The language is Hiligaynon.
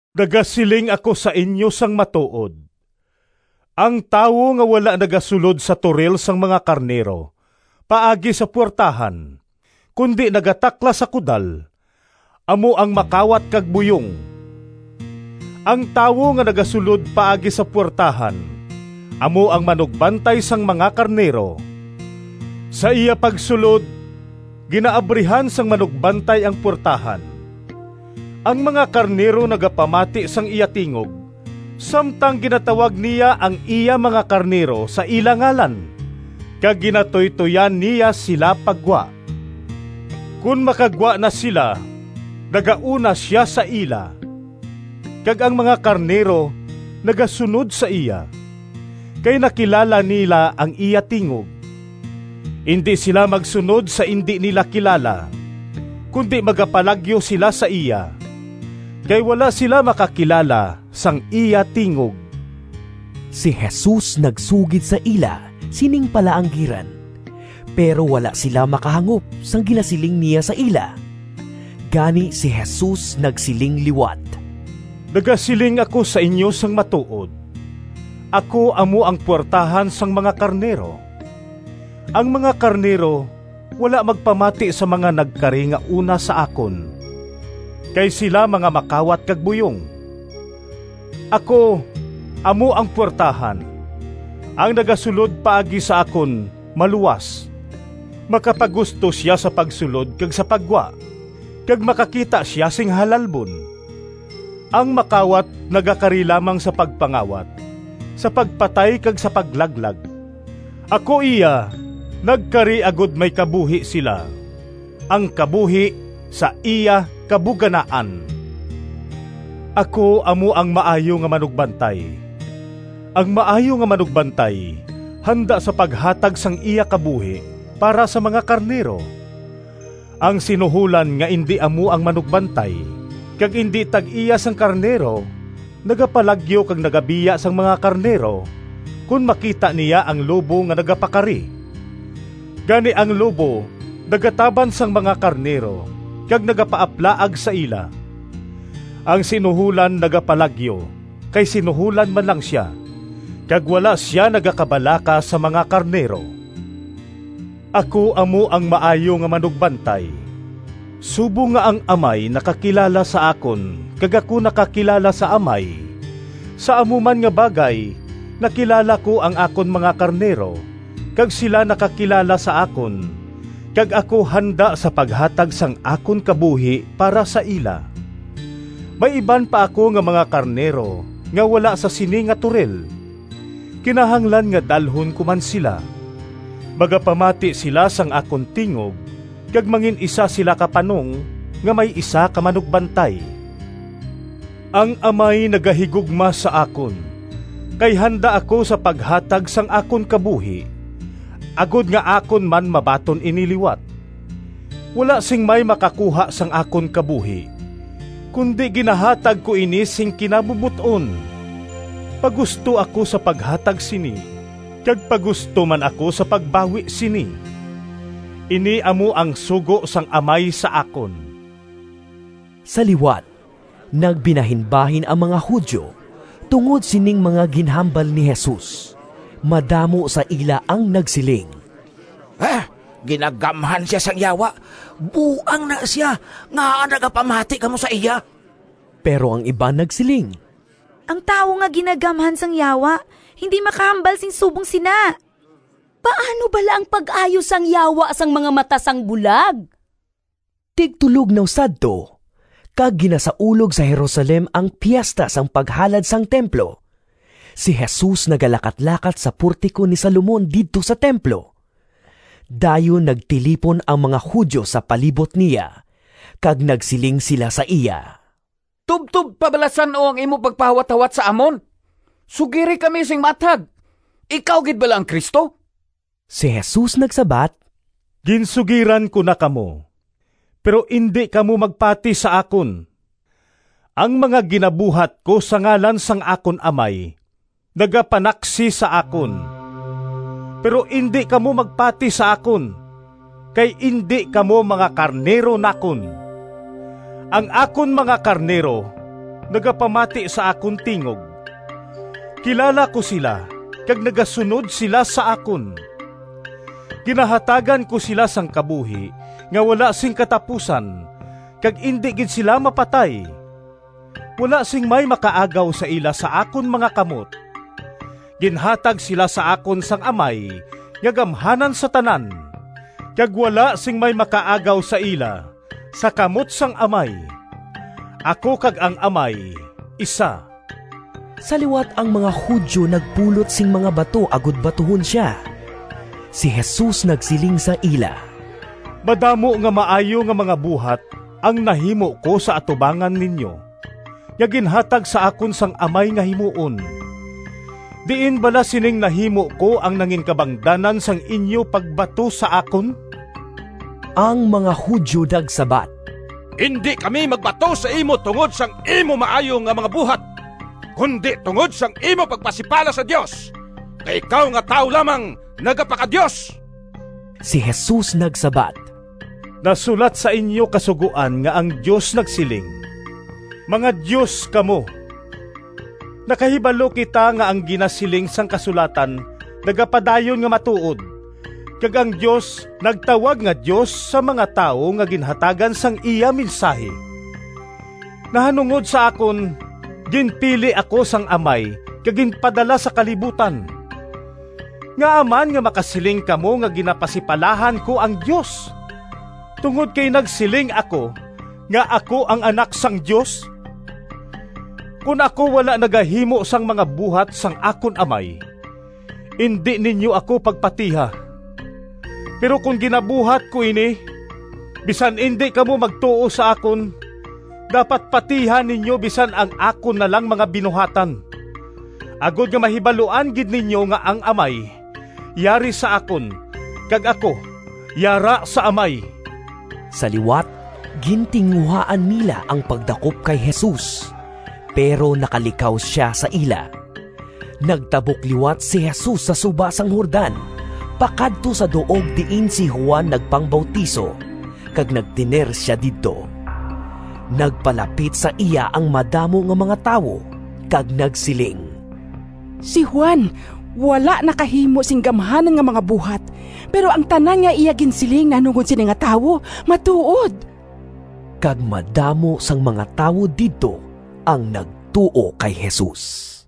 “Nagasiling ako sa inyo sang matuod: ang tawo nga wala nagasulod sa toril sang mga karnero paagi sa puwertahan, kundi nagataklas sa kudal, amo ang makawat kag buyong. Ang tawo nga nagasulod paagi sa puwertahan amo ang manugbantay sang mga karnero. Sa iya pagsulod ginaabrihan sang manugbantay ang puwertahan. Ang mga karnero nagapamati sang iya tingog samtang ginatawag niya ang iya mga karnero sa ila ngalan, kag ginatuytoyan niya sila pa gwa. Kon makagwa na sila, nagauna sia sa ila, kag ang mga karnero nagasunod sa iya, kay nakilala nila ang iya tingog. Indi sila magsunod sa indi nila kilala, kundi magapalagyo sila sa iya, kay wala sila makakilala sang iya tingog.” Si Jesus nagsugid sa ila sining palaanggiran, pero wala sila makahangop sang ginasiling niya sa ila. Gani si Jesus nagsiling liwat, “Nagasiling ako sa inyo sang matuod: ako amo ang puwertahan sang mga karnero. Ang mga karnero wala magpamati sa mga nagkari nga una sa akon, kay sila mga makawat kag buyong. Ako amo ang puwertahan. Ang nagasulod paagi sa akon maluwas. Makapagusto sia sa pagsulod kag sa paggwa, kag makakita sia sing halalbon. Ang makawat nagakari lamang sa pagpangawat, sa pagpatay kag sa paglaglag. Ako iya nagkari agod may kabuhi sila, ang kabuhi sa iya kabuganaan. “Ako amo ang maayo nga manugbantay. Ang maayo nga manugbantay handa sa paghatag sang iya kabuhi para sa mga karnero. Ang sinuholan nga indi amo ang manugbantay, kag indi tag-iya sang karnero, nagapalagyo kag nagabiya sang mga karnero, kon makita niya ang lobo nga nagapakari; gani ang lobo nagataban sang mga karnero kag nagapaaplaag sa ila. Ang sinuholan nagapalagyo, kay sinuholan man lang sia, kag wala sia nagakabalaka sa mga karnero. Ako amo ang maayo nga manugbantay. Subong nga ang Amay nakakilala sa akon kag ako nakakilala sa Amay, sa amo man nga bagay nakilala ko ang akon mga karnero, kag sila nakakilala sa akon; kag ako handa sa paghatag sang akon kabuhi para sa ila. May iban pa ako nga mga karnero nga wala sa sini nga toril. Kinahanglan nga dalhon ko man sila. Magapamati sila sang akon tingog kag mangin-isa sila ka panong nga may isa ka manugbantay. “Ang Amay nagahigugma sa akon, kay handa ako sa paghatag sang akon kabuhi, agod nga akon man mabaton ini liwat. Wala sing may makakuha sang akon kabuhi, kundi ginahatag ko ini sing kinabubot-on. Pagusto ako sa paghatag sini, kag pagusto man ako sa pagbawi sini. Ini amo ang sugo sang Amay sa akon.” Sa liwat nagbinahinbahin ang mga Judio tungod sining mga ginhambal ni Jesus. Madamo sa ila ang nagsiling, “Ginagamhan sia sang yawa! Buang ina sia! Ngaa nagapamati kamo sa iya?” Pero ang iban nagsiling, “Ang tawo nga ginagamhan sang yawa indi makahambal sing subong sina! Paano bala ang pag-ayo sang yawa sang mga mata sang bulag?” Tigtulognaw sadto, kag ginasaulog sa Jerusalem ang Piesta sang Paghalad sang Templo. Si Jesus nagalakatlakat sa Portico ni Salomon didto sa templo. Dayon nagtilipon ang mga Judio sa palibot niya kag nagsiling sila sa iya, “Tubtob pa bala san-o ang imo pagpahawathawat sa amon? Sugiri kami sing maathag, ikaw gid bala ang Cristo?” Si Jesus nagsabat, “Ginsugiran ko na kamo, pero indi kamo magpati sa akon. Ang mga ginabuhat ko sa ngalan sang akon Amay nagapanaksi sa akon, pero indi kamo magpati sa akon kay indi kamo mga karnero nakon. Ang akon mga karnero nagapamati sa akon tingog. Kilala ko sila kag nagasunod sila sa akon. Ginahatagan ko sila sang kabuhi nga wala sing katapusan, kag indi gid sila mapatay. Wala sing may makaagaw sa ila sa akon mga kamot. Ginhatag sila sa akon sang Amay nga gamhanan sa tanan, kag wala sing may makaagaw sa ila sa kamot sang Amay. Ako kag ang Amay isa.” Sa liwat ang mga Judio nagpulot sing mga bato agod batuhon sia. Si Jesus nagsiling sa ila, “Madamo nga maayo nga mga buhat ang nahimo ko sa atubangan ninyo nga ginhatag sa akon sang Amay nga himuon. Diin bala sining nahimo ko ang nanginkabangdanan sang inyo pagbato sa akon?” Ang mga Judio nagsabat, “Indi kami magbato sa imo tungod sang imo maayo nga mga buhat, kundi tungod sang imo pagpasipala sa Dios! Kay ikaw nga tawo lamang, nagapaka-Dios!” Si Jesus nagsabat, “Nasulat sa inyo Kasugoan nga ang Dios nagsiling, ‘Mga dios kamo.’ Nakahibalo kita nga ang ginasiling sang kasulatan nagapadayon nga matuod kag ang Dios nagtawag nga dios sa mga tawo nga ginhatagan sang iya mensahi. Nahanungod sa akon, ginpili ako sang Amay kag ginpadala sa kalibutan. Ngaa man nga makasiling kamo nga ginapasipalahan ko ang Dios tungod kay nagsiling ako nga ako ang Anak sang Dios? Kon ako wala nagahimo sang mga buhat sang akon Amay, indi ninyo ako pagpatiha. Pero kon ginabuhat ko ini, bisan indi kamo magtuo sa akon, dapat patihan ninyo bisan ang akon na lang mga binuhatan, agod nga mahibaluan gid ninyo nga ang Amay yari sa akon kag ako yara sa Amay.” Sa liwat gintinguhaan nila ang pagdakop kay Jesus, pero nakalikaw sia sa ila. Nagtabok liwat si Jesus sa suba sang Jordan pakadto sa duog diin si Juan nagpangbautiso, kag nagtener sia didto. Nagpalapit sa iya ang madamo nga mga tawo, kag nagsiling, “Si Juan wala nakahimo sing gamhanan nga mga buhat, pero ang tanan nga iya ginsiling nahanungod sini nga tawo matuod.” Kag madamo sang mga tawo didto ang nagtuo kay Jesus.